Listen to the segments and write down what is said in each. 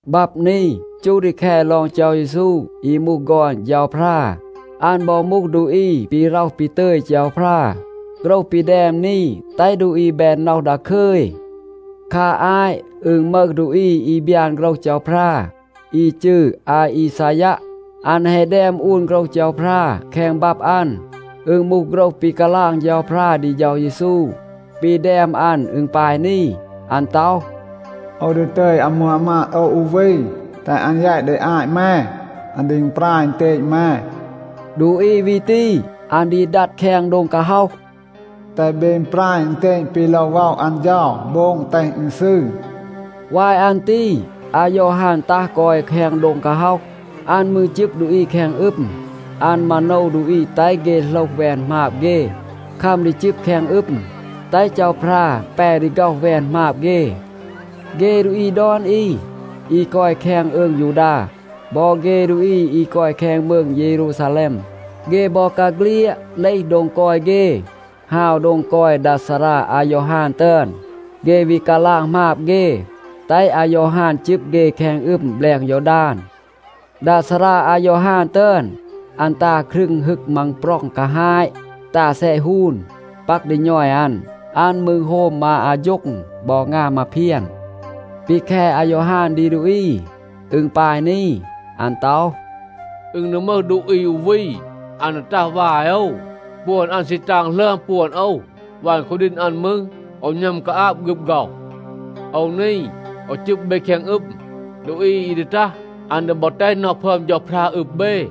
บับ นี จูห ดี แค ลอง เฌา เยซู อี มูห ฆอน เฌาพรา. อัน บอ มูห ดูอี ปี ร็อห ปี ตึย เฌาพรา. โฆรห ปี แดม นี แตห ดูอี แบน น็อห ดาคึย. คา อาต อึณ มึห ดูอี อี บยาน โฆรห เฌาพรา อี จืร อาอีซายัะ. อัน แฮะ แดม อูน โฆรห เฌาพรา แคง บับ อัน. อึณ มูห โฆรห ปี กาลาง เฌาพรา ดี เฌา เยซู. ปี แดม อัน อึณ ปาย นี. อัน ต็อห, “โอว ดี ตึย อามู อามาด โอว อู วี, แตห อัน แยต ดี อาต แม. อัน ดี อึณปราย อึณเตณ แม.” ดูอี วี ตี, อัน ดี ดัด แคง โดง กาฮ็อห, “แตห เบ อึณปราย อึณเตณ ปี โลว ว็อะ อัน เฌา. โบง, แตห อึณ ซืร.” วาย อัน ตี อายอฮาน ตัห กอย แคง โดง กาฮ็อห, อัน มืร จึบ ดูอี แคง อึม. อัน มาโนว ดูอี แตห เฆ โหลห แวน หมาบ เฆ, คัม ดี จึบ แคง อึม, แตห เฌาพรา แป ดี ฆ็อห แวน หมาบ เฆ. เฆ ดูอี ดอน อี, อี กอย แคง อืง ยูดา, บอ เฆ ดูอี อี กอย แคง มืง เยรูซาแลม, เฆ บอกาเฆลียด เลห โดง กอย เฆ, ฮาว โดง กอย ดา ซารา อายอฮาน ตึอน. เฆ วี กาลาง หมาบ เฆ, แตห อายอฮาน จึบ เฆ แคง อึม แบลง ยอดาน. ดา ซารา อายอฮาน ตึอน, อัน ตา ครึง ฮึก มังปร็อง กาฮาต, ตา แซะ ฮูน, ปัก ดี ณอย อัน. อัน มืร โฮม มา อาโฌ็ง บอ งาม มาเพียน.a ปี แค อายอฮาน ดี ดูอี, อึณ ปาย นี. อัน ต็อห, “อึณ ดี มึห ดูอี อู วี, อัน ดี ตัห วาย โอว. ปวน อัน ซี ตาง หลึอม ปวน โอว. วัน คูดีณ อัน มืร, โอว หณัม กาอาบ ฆึบ ฆ็อห. โอว นี, โอว จึบ เบ แคง อึม. ดูอี อี ดี ตัห, อัน ดี บอ แตห น็อห พึอม เฌาพรา อึบ เบ.”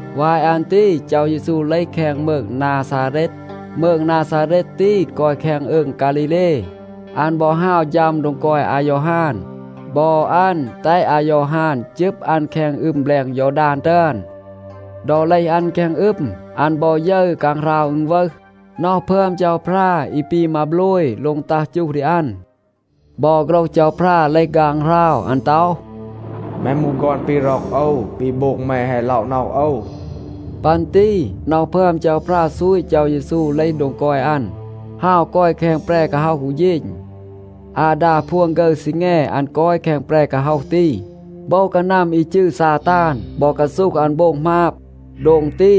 วาย อัน ตี เฌา เยซู เลห แคง มืง นาซาเรต. มืง นาซาเรต ตี กอย แคง อืง ฆาลีเล. อัน บอ ฮาว ฌัม โดง กอย อายอฮาน. บอ อัน แตห อายอฮาน จึบ อัน แคง อึม แบลง ยอดาน ตึอน. ดอ เลห อัน แคง อึม, อัน บอ ยึร ฆางหราว อึณวึห. น็อห พึอม เฌาพรา อี ปี มาโบลย โลง ตัห จูห ดี อัน. บอ โฆรห เฌาพรา เลห ฆางหราว. อัน ต็อห, “แม มูห ฆอน ปี ร็อก โอว. ปี โบง แม แฮะ ล็อะ น็อห โอว.” ปัน ตี น็อห พึอม เฌาพรา ซูต เฌา เยซู เลห โดง กอย อัน, ฮาว กอย แคง แปร กาฮ็อห อู เฌณ. อาดา พวน ฆึร ซีแง อัน กอย แคง แปร กาฮ็อห ตี. โบว กานัม อี จืร ซาตาน บอ กาซูห อัน โบง หมาบ. โดง ตี,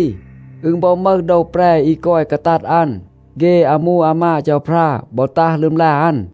อึณ บอ มึห โดว แปร อี กอย กาตัด อัน. เฆ อามู อามาด เฌาพรา บอ ตัห ลึมลา อัน.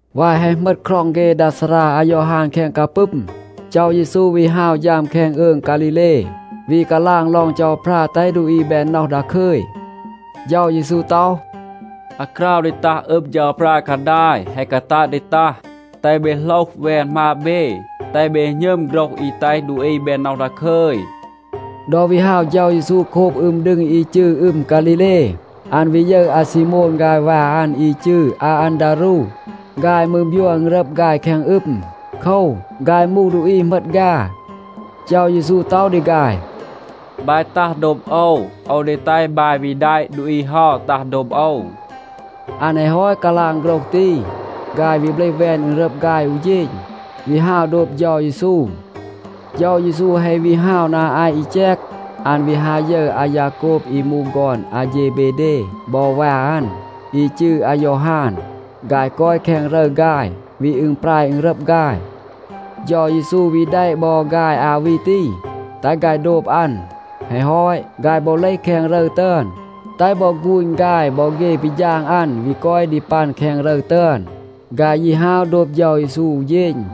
วาย แฮะ เหมต คร็อง เฆ ดา ซารา อายอฮาน แคง กาปึม, เฌา เยซู วี ฮาว ฌัม แคง อืง ฆาลีเล, วี กาลาง ลอง เฌาพรา แตห ดูอี แบน น็อห ดาคึย. เฌา เยซู ต็อห, “อาคราว ดี ตัห อึบ เฌาพรา กาดาย แฮะ กาตัด ดี ตัห. แตห เบ โหลห แวน หมาบ เบ, แตห เบ หณึม โฆรห อี แตห ดูอี แบน น็อห ดาคึย.” ดอ วี ฮาว เฌา เยซู โคบ อึม ดึง อี จืร อึม ฆาลีเล, อัน วี ยึร อาซีโมน ฆาย วา อัน อี จืร อาอันดารู. ฆาย มืร บยัว อึณรับ ฆาย แคง อึม. โคว, ฆาย มูห ดูอี เหมต ฆา. เฌา เยซู ต็อห ดี ฆาย, “บาย ตัห โดบ โอว. โอว ดี แตห บาย วี แดะ ดูอี เฮา ตัห โดบ โอว.” อัน แฮะ ฮอต กาลาง โฆรห ตี, ฆาย วี เบลห แวน อึณรับ ฆาย อู เฌณ, วี ฮาว โดบ เฌา เยซู. เฌา เยซู แฮะ วี ฮาว นา อาต อี แจก, อัน วี ฮา ยึร อายาโกบ อี มูห ฆอน อาเฌเบเด บอ วา อัน, อี จืร อายอฮาน. ฆาย กอย แคง รึร ฆาย, วี อึณปราย อึณรับ ฆาย. เฌา เยซู วี แดะ บอ ฆาย อา วี ตี, แตห ฆาย โดบ อัน. แฮะ ฮอต, ฆาย บอ เลห แคง รึร ตึอน, แตห บอ ฆูณ ฆาย บอ เฆ ปี ฌาง อัน วี กอย ดี ปัน แคง รึร ตึอน. ฆาย ยี ฮาว โดบ เฌา เยซู อู เฌณ.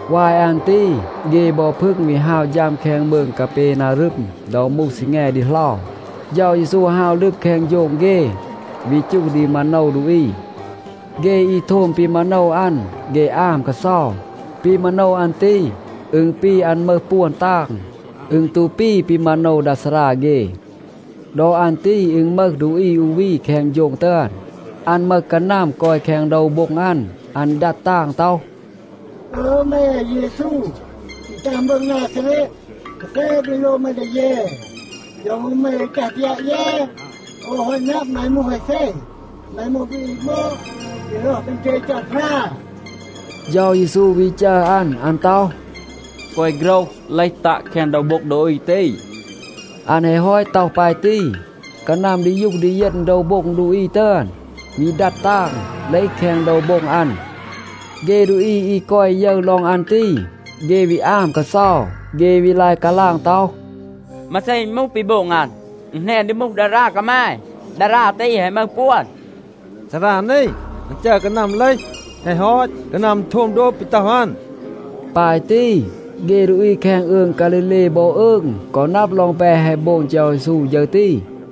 วาย อัน ตี เฆ บอ พึง วี ฮาว ฌัม แคง มืง กาเปนารึม. ดอ มูห ซีแง ดีเหลา, เฌา เยซู ฮาว ลึบ แคง โฌง เฆ, วี จูห ดี มาโนว ดูอี. เฆ อี โทม ปี มาโนว อัน, เฆ อาม กาเซา. ปี มาโนว อัน ตี, อึณ ปี, อัน มึห ปวน ตาง. อึณ ตู ปี ปี มาโนว ดา ซารา เฆ. ดอ อัน ตี อึณ มึห ดูอี อู วี แคง โฌง ตึอน. อัน มึห กานัม กอย แคง โดว โบ็ง อัน. อัน ดัด ตาง ต็อห, “อึย แม อาเยซู อี ตัห มืง นาซาเรต, มาเซ ปี โลว แม ดี เย? โยว มืร แม ดี ตัห ปยาต เย? โอว แฮะ นับ, แม มูห อาเซ. แม มูห ดูอี บอด ปี ร็อห ปี ตึย เฌาพรา.” เฌา เยซู วี จัร อัน. อัน ต็อห, “แกวะ โฆรห, เลห ตัะ แคง โดว โบ็ง ดูอี ตี.” อัน แฮะ ฮอต ต็อห ปาย ตี, กานัม ดียูห ดีเยณ โดว โบ็ง ดูอี ตึอน, วี ดัด ตาง, เลห แคง โดว โบ็ง อัน. เฆ ดูอี อี กอย ยึร ลอง อัน ตี, เฆ วี อาม กาเซา. เฆ วี ลาย กาลาง ต็อห, “มาเซ อึณ มูห, ปี โบง อัน? อึณ แหนน ดี มูห ดารา กามาย. ดารา ตี แฮะ มึห ปวน. ซารา นี, อัน จัร เฆ กานัม เลห. แฮะ ฮอต, กานัม โทม โดบ ปี ต็อห อัน.” ปาย ตี, เฆ ดูอี แคง อืง ฆาลีเล บอ อืง กอ นับ ลอง แปะ แฮะ โบง เฌา เยซู ฌึร ตี.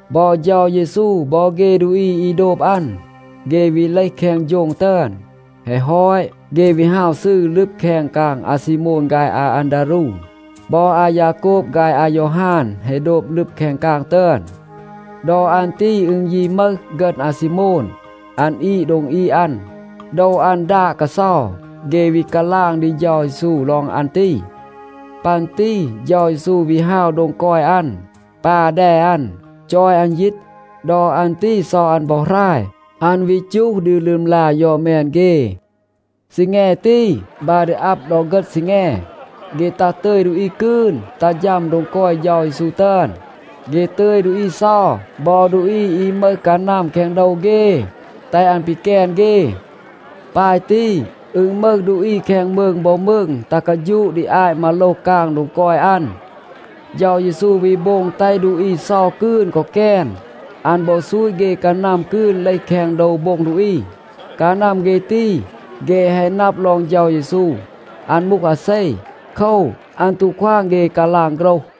บอ เฌา เยซู บอ เฆ ดูอี อี โดบ อัน, เฆ วี เลห แคง โฌง ตึอน. แฮะ ฮอต, เฆ วี ฮาว ซืร ลึบ แคง กาง อาซีโมน ฆาย อาอันดารู. บอ อายาโกบ ฆาย อายอฮาน แฮะ โดบ ลึบ แคง กาง ตึอน. ดอ อัน ตี อึณ ยี มึห ฆึณ อาซีโมน, อัน อีด โดง อีด อัน. โดว อัน ดาด กาเซา. เฆ วี กาลาง ดี เฌา เยซู ลอง อัน ตี. ปัน ตี เฌา เยซู วี ฮาว โดง กอย อัน, ปา แด อัน, จอย อัน ยีต. ดอ อัน ตี เซา อัน บอ หราย. อัน วี จูห ดี ลึมลา ยอด แมน เฆ. ซีแง ตี, บา ดี อับ ดอ เฆต ซีแง, เฆ ตัห ตึย ดูอี กืน ตัห ฌัม โดง กอย เฌา เยซู ตึอน. เฆ ตึย ดูอี เซา บอ ดูอี อี มึห กานัม แคง โดว เฆ, แตห อัน ปีแกน เฆ. ปาย ตี, อึณ มึห ดูอี แคง มืง บอ มืง ตัห กาฌูะ ดี อาต มาโลห กาง โดง กอย อัน. เฌา เยซู วี โบง แตห ดูอี เซา กืน กอ แกน. อัน บอ ซูต เฆ กานัม กืน เลห แคง โดว โบ็ง ดูอี. กานัม เฆ ตี, เฆ แฮะ นับ ลอง เฌา เยซู, อัน มูห อาเซ. โคว, อัน ตู ควาง เฆ กาลาง โฆรห.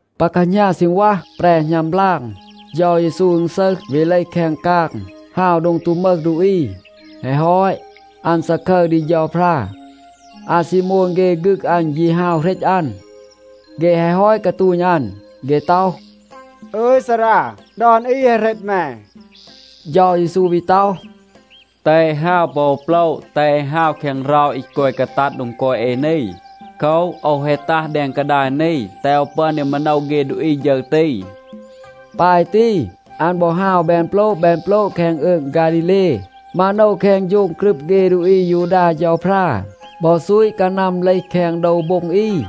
ปา แคหณา ซีณวัห, แปร หณัม บลาง, เฌา เยซู อึณซึห, วี เลห แคง กาง, ฮาว โดง ตู มึห ดูอี. แฮะ ฮอต, อัน ซาคึร ดี เฌาพรา. อาซีโมน เฆ ฆึก อัน ยี ฮาว เหรต อัน. เฆ แฮะ ฮอต กาตูณ อัน, เฆ ต็อห, “อึย ซารา, ดอน อี แฮะ เหรต แม.” เฌา เยซู วี ต็อห, “แตห เอ ฮาว ปอ อู โปละ. แตห เอ ฮาว แคง เรา อี กอย กาตัด โดง กอย เอ นี. โคว, โอว แฮะ ตัห แดง กาดาย นี, แตห โอว ปึอน ดี มาโนว เฆ ดูอี ฌึร ตี.” ปาย ตี อัน บอ ฮาว แบน โปละ แบน โปละ แคง อืง ฆาลีเล, มาโนว แคง โฌง กรึบ เฆ ดูอี อายูดา เฌาพรา บอ ซูต กานัม เลห แคง โดว โบ็ง อี.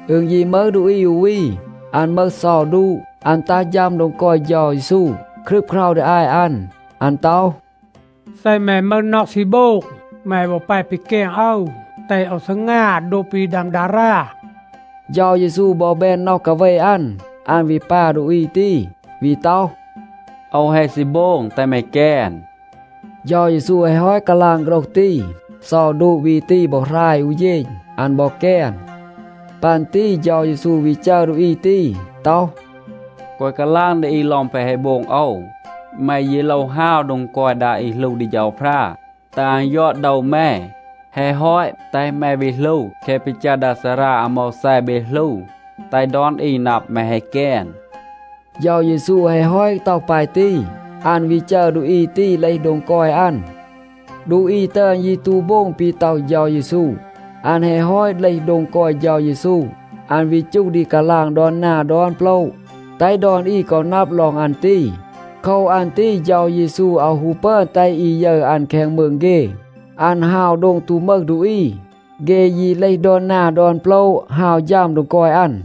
อึณ ยี มึห ดูอี อู วี, อัน มึห เซา ดูะ.b อัน ตัห ฌัม โดง กอย เฌา เยซู, ครึบเครา ดี อาต อัน. อัน ต็อห, “เซ แม มึห น็อห ซี โบง, แม บอ แป ปีแกน โอว, แตห โอว ซีงา โดบ ปี ดัม ดารา.” เฌา เยซู บอ แบน น็อห กาเว อัน, อัน วี ปา ดูอี ตี, วี ต็อห, “โอว แฮะ ซี โบง. แตห แม แกน.” เฌา เยซู แฮะ ฮอต กาลาง โฆรห ตี, เซา ดูะ วี ตี บอ หราย อู เฌณ. อัน บอ แกน. ปัน ตี เฌา เยซู วี จัร ดูอี ตี, ต็อห “แกวะ กาลาง ดี อี ลอง แปะ แฮะ โบง โอว. แม ยี โลว ฮาว โดง กอย ดา อี หลู ดี เฌาพรา, แตห อัน ยอด โดว แม. แฮะ ฮอต, แตห แม วี หลู แคะ ปี จัร ดา ซารา อาโมวแซ เบ หลู, แตห ดอน อี นับ, แม แฮะ แกน.” เฌา เยซู แฮะ ฮอต ต็อห ปาย ตี, อัน วี จัร ดูอี ตี เลห โดง กอย อัน. ดูอี ตึอน ยี ตู โบง ปี ต็อห เฌา เยซู. อัน แฮะ ฮอต เลห โดง กอย เฌา เยซู, อัน วี จูห ดี กาลาง ดอน นา ดอน โปละ, แตห ดอน อี กอ นับ ลอง อัน ตี. โคว อัน ตี เฌา เยซู อาว ฮู ปึอน แตห อี ยึร อัน แคง มืง เฆ. อัน ฮาว โดง ตู มึห ดูอี. เฆ ยี เลห ดอน นา ดอน โปละ ฮาว ฌัม โดง กอย อัน.